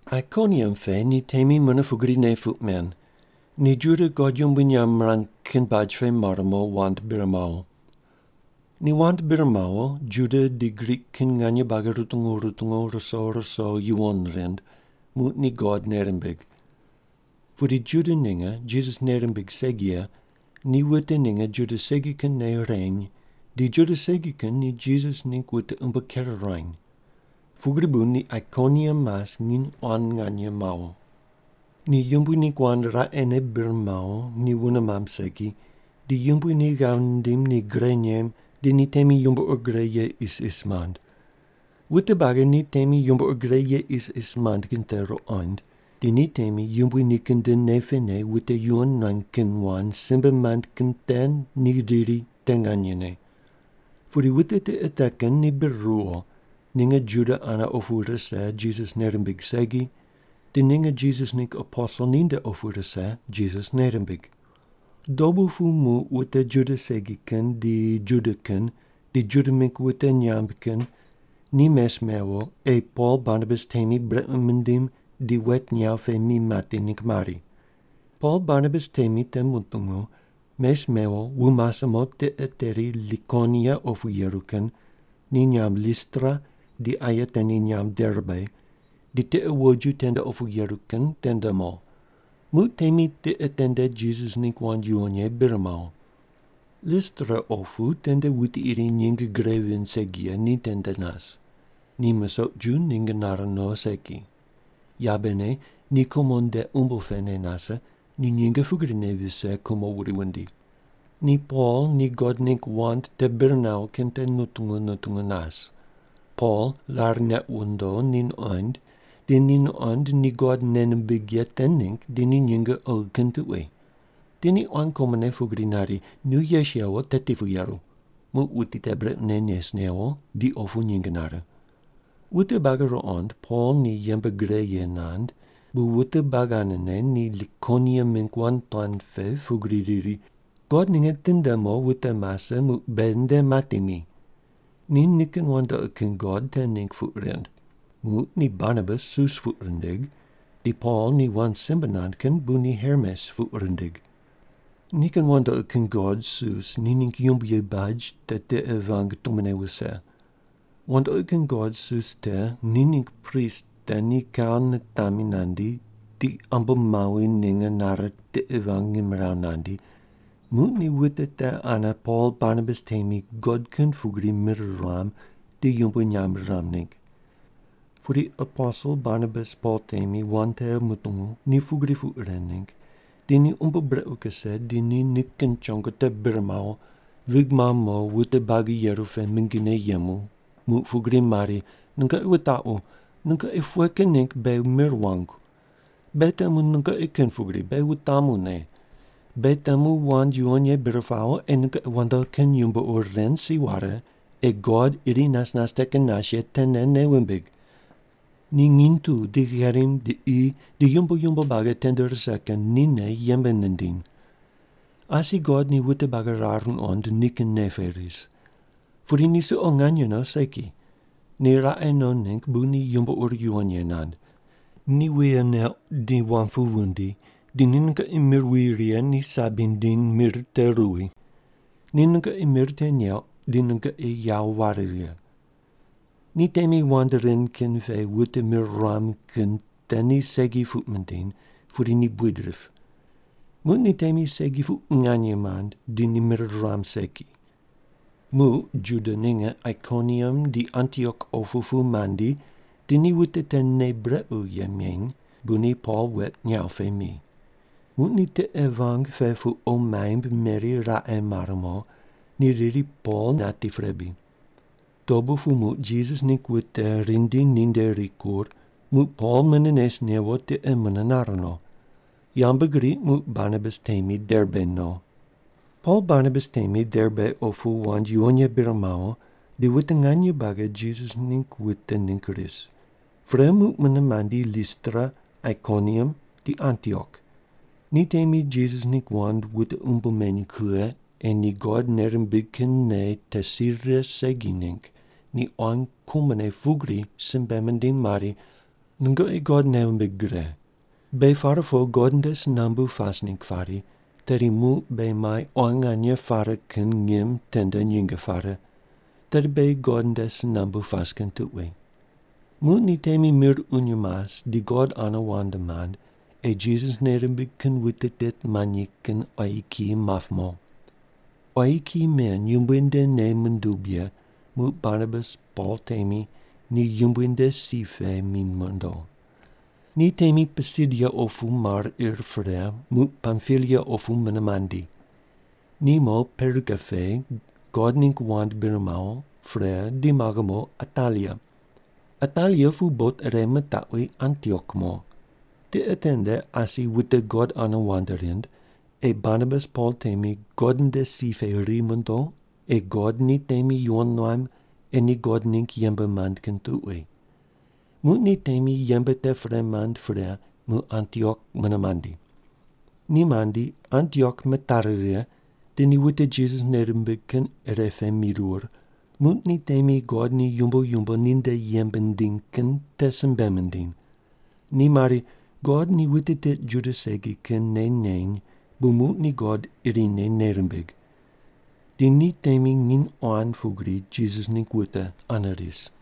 Aikoniam pe ni temi mune pugrine puq men. Ni Juda God yumbui nyamb mirang kin baj pe mar mo, wand bir mawo. Ni wand bir mawo, Juda di Grik kin nganye buagi rutungu rutungu ruso ruso yuwon rind, muq ni God nei rimbig. Pudi Juda ninge Jisas nei rimbig segi ye ni wute ninge Juda segi kin nei reny, di Juda segi kin ni Jisas ningg wute umbo ker ruany. Pugri bu ni Aikoniam mas nginy quan nganye mawo. Ni Yumbui ningg wand raqene bir mawo ni wune mamb segi, di Yumbui ni ghav nindim ni gre nem, di ni temi yumbo ur gre ye isis mand. Wute buagi ni temi yumbo ur gre ye isis mand kin te ruqond, di ni temi Yumbui nikin nde nei pene wute yuwon nuany kin wand simbe mand kin te ni riri te nganyene. Pudi wute tiqe te kin ni bir ruwo, ninge Juda ane opu rise Jisas nei rimbig segi, di ninge Jisas ningg aposel ninde opu rise Jisas nei rimbig. Dobu pu muq wute Juda segi kin di Juda kin di Juda mingg wute nyamb kin ni mes mewo, ei Pol Barnabas temi brequ mindim di wet nyaw pe mi mati ningg mari. Pol Barnabas temi te mutungu, mes mewo wu mase mo tiqe teri Likonia opu yeru kin, ni nyamb Listra di aye te ni nyamb Derbe, di tiqe woju tende opu yeru kin tende mo. Muq temi tiqe tende Jisas ningg wand yuwon ye bir mawo. Listra opu tende wuti iri nyinge gre vind segi ye ni tende nas. Ni musoq ju nyinge nare no segi. Yabene ni kumo nde umbo pene nase, ni nyinge pugrine vise kumo wuri wundi. Ni Pol ni God ningg wand te bir nawo kin te nutungu nutungu nas. Pol rar neq wundo ni nuqoind di ni nuqond ni God nei nimbig ye te ningg di ni nyinge oghi kin tuqui. Di ni quan kumone pugri nari, “Nu yes yewo, teti pu yeru.” Muq wuti te brequne nes newo, di opu nyinge nare. Wute buagi ruqond Pol ni yembe gre ye nand, bu wute buagi anene ni Likonia mingg wand tuan pe pugri riri, “God ninge tinde mo wute mase, muq beghi nde mati mi.” Ni nikin wandoqi kin god te ningg puq rind. Muq ni Barnabas Sus puq rindig. Di Pol ni wand simbe nand kin bu ni Hermes puq rindig. Nikin wandoqi kin god Sus ni ningg yumboyi baj te tiqe vang tumone wuse. Wandoqi kin god Sus te ni ningg prist te ni kau nitami nandi, di ambomawi ninge nare tiqe vang ngimrawu nandi, muq ni wute te ane Pol Barnabas temi god kin pugri mir ruam di yumbui nyamb riram ningg. Pudi aposel Barnabas Pol temi wand te mutungu ni pugri puq ren ningg, di ni umbo brequ kuse di ni nikin chongo te bir mawo, vig mamb mo wute buagi yeru pe mingine yemu, muq pugri mari, “Nungoqi wutaqu, nungoqi pughe kin ningg beghi mir wangu? Beghi temu nungoqi kin pugri, beghi wutamu ne. Beghi temu wand yuwon ye bir pawo ei nungoqi wandoqi kin yumbo ur ren si ware, ei God iri nas nas te kin nas ye tene nei wumbig. Ni nginy tu di gherim di qi di yumbo yumbo buagi tende rise kin nine yembe nindiny. Asi God ni wute buagi rar nuqond nikin nei pe ris. Pudi ni suqo nganye no segi. Ni raqe no ningg bu ni yumbo ur yuwon ye nand. Ni wuye neuq di wam pu wundi, di ni nungoqi mir wi righe ni sabi nindiny mir te ruwi. Ni nungoqi mir te neuq, di nungoqi yawo ware righe.” Ni temi wand ren kin pe wute mir ruam kin te ni segi puq mindiny, pudi ni buid rip. Muq ni temi segi puq nganye mand, di ni mir ruam segi. Muq Juda ninge Aikoniam di Antiok opu pu mandi di ni wute te nei brequ ye meny, bu ni Pol wet nyaw pe mi. Muq ni tiqe vang pe pu qo maimb meri raqe mar mo. Ni riri Pol nati pre bri. Dobu pu muq Jisas ningg wute rindi ninde rikur, muq Pol mune nes newo tiqe mune nar no. Yambgriq muq Barnabas temi Derbe mo. Pol Barnabas temi Derbe opu wand yuwon ye bir mawo di wute nganye buagi Jisas ningg wute ningg ris. Pre muq mune mandi Listra, Aikoniam di Antiok. Ni temi Jisas ningg wute umbo meny kughe ei ni God nei rimbig kin nei te si rire segi ningg ni quan kumone pugri simbe mindiny mari, “Nungoqi God nei wumbig gre. Beghi par po God nde si nambu pas ningg pari, tedi muq beghi mai quan nganye pare kin ngim tende nyinge pare, tedi beghi God nde si nambu pas kin tuqui.” Muq ni temi mir uny mas di God ane wand mand ei Jisas nei rimbig kin wute tit manyi kin quayi kiyi map mo. Quayi kiyi men Yumbui nde nei mundub ye, muq Barnabas Pol temi ni Yumbui nde si pe mi mondo. Ni temi Pisidia opu mar ir pre, muq Pampilia opu mune mandi. Ni mo Perga pe God ningg wand bir mawo, pre di maghe mo Atalia. Atalia pu bot ire mitaqwi Antiok mo. Tiqe tende asi wute God ane wand rind, ei Barnabas Pol temi God nde si pe ri mondo ei God ni temi yuwon nuam ei ni God ningg yembe mand kin tuqui. Muq ni temi yembe te pre mand pre muq Antiok mune mandi. Ni mandi Antiok mitari righe di ni wute Jisas nei rimbig kin irepe mirur, muq ni temi God ni yumbo yumbo ninde yembe nindiny kin te simbe mindiny. Ni mari, “God ni wute tit Juda segi kin nei neny bu muq ni God irine nei rimbig.” Di ni temi nginy quan pugri Jisas ningg wute ane ris.